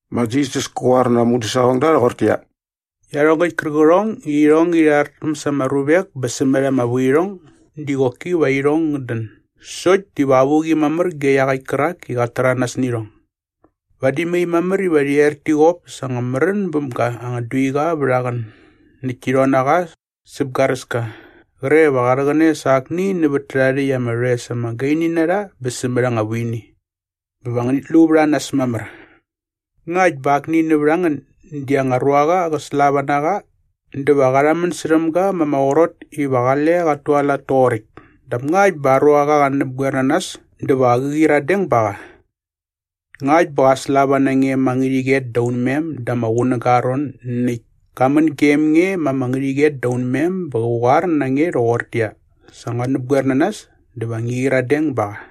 Ma Jisas kä qoar na aa mudäsaqongda rhoqortäqyia, “Iarhongäkt kärqärhong i irhong ngärhi rhartäm sa ama ruvek bä sämät ama vuirhong diva qoki va irhong ngät dän sokt diva avuqi mamär ge iaqäkt kärak i qat täranas nä irhong. Vadi mai mamär iva rhi er ti qop sa anga märän bäm ga anga duiqa vät aa qän näkt ti rhon na qa säp garäska qre va qa rhäqäne sa akni nävät tärhae rhäkt ama rhoes ama gaini na rha bä sämät anga vuini. Bä va ngänit lu vät a nas mamär.” “Ngakt bä akni nävät a ngän di aa anga ruaqa qä slava na qa dä va qa rhamän särhäm ga ma ama qrot iva qale qat tualat toqoräkt dap ngakt bä aa ruaqa qä näpgoer na nas dä va qä qyiradeng ba qa. Ngakt bä qa slava na nge ma ngärhäqyet da unmem da ama qunäga aa ron näkt ka män gem nge ma ngärhäqyet da unmem bä qä qoar na nge rhoqortäqyia, ‘Sa ngua näpgoer na nas’ dä va ngi qyiradeng ba qa.”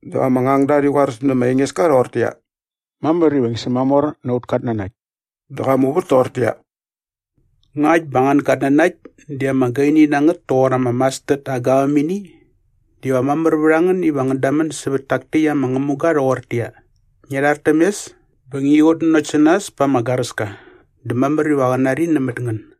Dä ama ngangda rhi qoaräs nä ma Engeska rhoqortäqyia, “Mamär iva ngi sämamor na aut katnanakt.” Dä qa muvät toqortäqyia, “Ngakt bä nga angän gatnanakt di ama gaini na ngät toqor ama mastard aa gavämini diva mamär vät a ngän iva ngän damän sävät tak täkt ama ngämuga rhoqortäqyia, ‘Ngia rhar täm mes bä ngi qutnanokt sä nas pa ama garäska’ dä mamär iva qä nari nämät ngän.”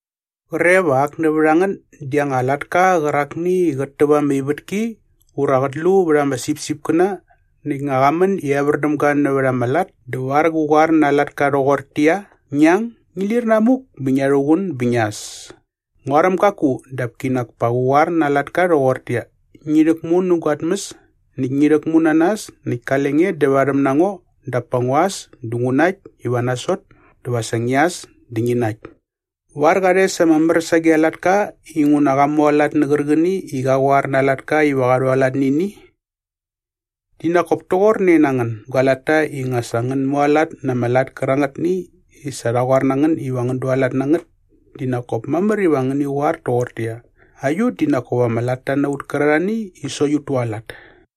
“Qre va ak nävät a ngän di aa anga latka qärakni i qät täp ama ivätki ura qät lu vät ama sipsipkäna näkt nga qa män i evär däm ga nävät ama lat dä var qä qoar na aa latka rhoqortäqyia, ‘Ngi ang, ngi lir namuk bä ngia rhuqun bä ngia äs’? Nguaräm gaku dap kinak pa qä qoar na aa latka rhoqortäqyia, ‘Ngi rhäkmu nä gua tmäs näkt ngi rhäkmu na nas näkt kale nge dävarhäm na ngo dap pa ngua äs dä ngu nakt iva nga nasot dä va sa ngia äs dä ngi nakt’? Var qa rhes ama mär sage aa latka inguna qa mualat nä qärqäni i qa qoar na aa latka iva qa rhualat nä ini? Di nak kop toqorne na ngän gua latta i nga sa ngän mualat na ama lat kärangätni i sa rha qoar na ngän iva ngän dualat na ngät di nak kop mamär iva ngäni qoar toqortäqyia, ‘Aiut di nak kop ama latta na ut kärarhani i sokt ut tualat!’”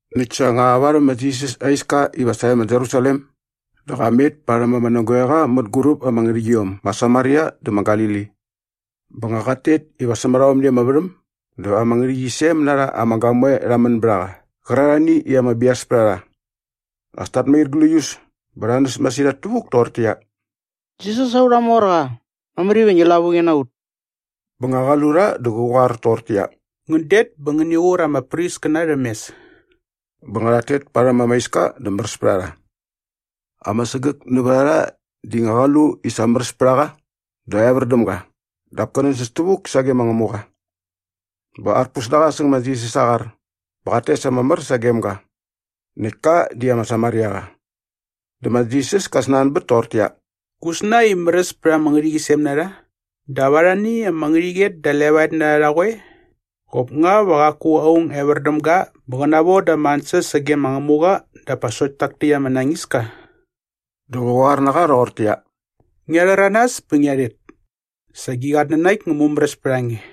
Näkt sa nga varhäm ma Jisas aa iska iva sae ma Jerusalem dä qa met parhäm ama nägoeqa mänguräp ama ngärhäqyiom ma Samaria dä ma Galili. Bä nga qat tet iva sämät aomni ama värhäm dä ama ngärhäqyisem na rha ama gamoe rha män bät a qa qärarhani i ama bias pät a rha. As tat mair gläius bä rha näs masirhat tävuk toqortäqyia, “Jisas aurha morqa, mamär iva ngi lavuqi na ut!” Bä nga qa lu rha dä qä qoar toqortäqyia, “Ngän det bä ngäni qur ama priskäna rhäm mes.” Bä nga rhat tet parhäm ama iska dä märäs pät a rha. Ama sägäk nävät a rha di nga qa lu i sa märäs pät a qa dä evär däm ga dap kä nänsäs tävuk sage ma Ngämuqa. Bä arpus na qa säng ma Jisas aa qar bä qat tes ama mär sagem ga. Näkt ka di ama Samariaqa. Dä ma Jisas ka snanbät toqortäqyia, “Gusna i märäs pät ama ngärhäqyisem na rha? Dap arhani ama ngärhäqyet da levaet na rha rha qoe? Qop nga va qaku aung evär däm ga bä qä navoda ama ansäs sage ma Ngämuqa dap pa sokt tak täkt ama nañiska?” Dä qä qoar na qa rhoqortäqyia, “Ngia rhäranas bä ngia rhet. Sa gi qatnanakt ngä mumäräs pät a nge.”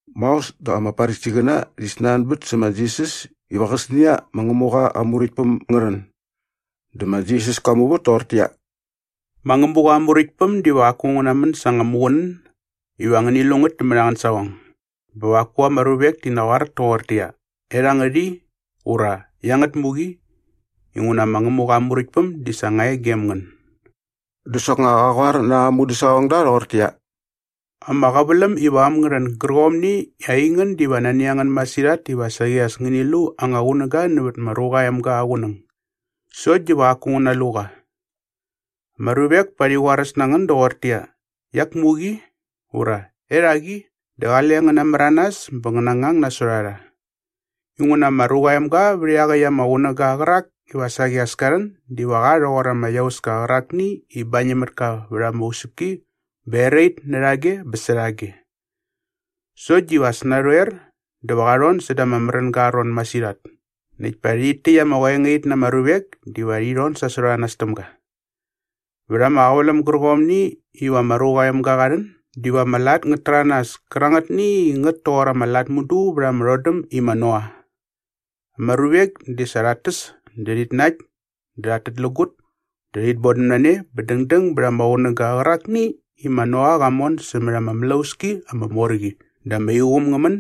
Maos dä ama Farisiqäna rhi snanbät sä ma Jisas iva qäsnia ma Ngämuqa aa Muräktpäm ngä rhän. Dä ma Jisas ka muvät toqortäqyia, “Ma Ngämuqa aa Muräktpäm diva qaku ngä namän sa anga muqunän iva ngäni lu nämät angän saqong bä va qaku ama ruvek ti naqoar toqortäqyia, ‘Erhangät i’ ura ‘Iangät muk i’ inguna ma Ngämuqa aa Muräktpäm di sa nga e gem ngän.” Dä soknga qa qoar na aa mudäsaqongda rhoqortäqyia, “Ama qäväläm iva äm ngä rhän gärqomni i aingän diva nani a ngän masirhat iva saqi as ngäni lu anga qunäga nävät ma Ruqa aa Emga aa qunäng sokt diva qaku ngän nalu qa. Ama ruvek pa rhi qoaräs na ngän doqortäqyia, ‘Iak muk i!’ ura ‘Erhak i!’ dä qale ngän namäranas bä ngän nangang nasot a rha. Inguna ma Ruqa aa Emga vät iaqäkt aa qunäga qärak iva saqi as ka rhän diva qa rhoqor ama iauska qärakni i bañäm mät ka vät ama usäpki bä erait närhage bä särhage. Sokt diva as narhoer dä va qa rhon säda ama märänga aa ron masirhat näkt pa rhit täkt ama qoengait na ama ruvek diva rhi rhon sasot a nas täm ga. Vät ama qäväläm gärqomni iva ma Ruqa aa Emga qa rhän diva ama lat ngät täranas kärangätni i ngät toqor ama lat mudu vät ama rhodäm i ma Noa. Ama ruvek di sa rhat täs dä rhit nakt dä rhat tätlägut dä rhit bodäm na ne bä dängdäng bät ama qunäga qärakni i ma Noa qa mon sämät ama mlauski ama mor qi dä ama iqum ngä män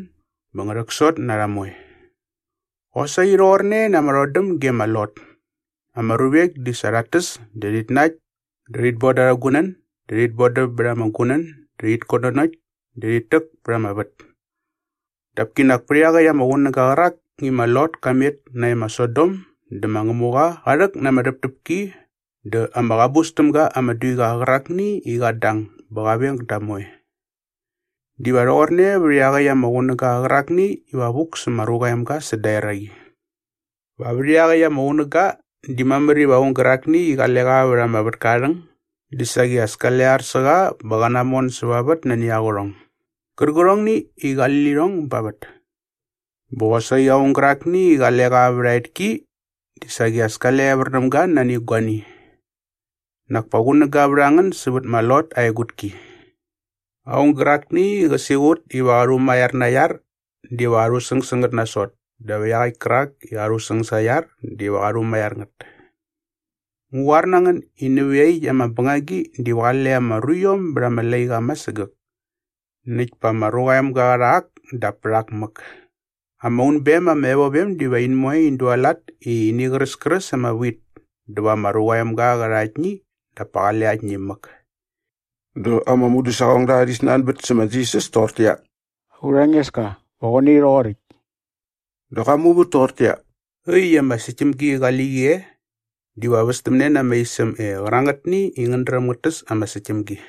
bä ngä rhäksot na rha moe. “Qosaqi rhoqorne na ama rhodäm ge ma Lot. Ama ruvek di sa rhat täs dä rhit nakt dä rhit boda arhä gunän dä rhit bodäm bät ama gunän dä rhit kutnanokt dä rhit täk pät ama vät. Dap kinak pät iaqäkt ama qunäga qärak i ma Lot ka met nae ma Sodom dä ma Ngämuqa qa rhäk na ama rhäptäpki dä ama qabus täm ga ama duiqa qärakni i qat dang bä qa veng da moe. Diva rhoqorne vät iaqäkt ama qunäga qärakni iva vuk sä ma Ruqa aa Emga säda eraqi. “Va vät iaqäkt ama qunäga di mamär iva aung gärakni i qale qa vät ama vätka aa rhäng di saqi as kale ar sä qa bä qä namon säva vät nani aa qärhong gärqärhongni i qali lirhong ba vät. Bä qosaqi aung gärakni i qale qa vät a etki di saqi as kale evär däm ga nani guani. Nak pa qunäga vät a ngän sävät ma Lot aa egutki! “Aung gärakni i qä siqut iva qa rhumaiar na aa iar diva qa rhusäng sä ngät nasot dap iaqäkt kärak i qa rhusäng sa aa iar diva qa rhumaiar ngät. Ngu qoar na ngän i nävä iaqyäkt ama bängagi diva qale ama ruiom bät ama laiqa ama sägäk näkt pa ma Ruqa aa Emga qä rha ak dap pät ak mäk. Ama unbem ama evovem diva in moe in dualat i ini qräskräs ama wit dä va ma Ruqa aa Emga qä rha aktni dap pa qale aktni mäk.” Dä ama mudäsaqongda rhi snanbät sä ma Jisas toqortäqyia, “Aurha Engeska, va qoe nai rhoqoräkt?” Dä qa muvät toqortäqyia, “Äkt i ama säktämgi qali qi e diva västämne na ama isäm e qärangätni i ngät dräm ngät täs ama säktämgi.”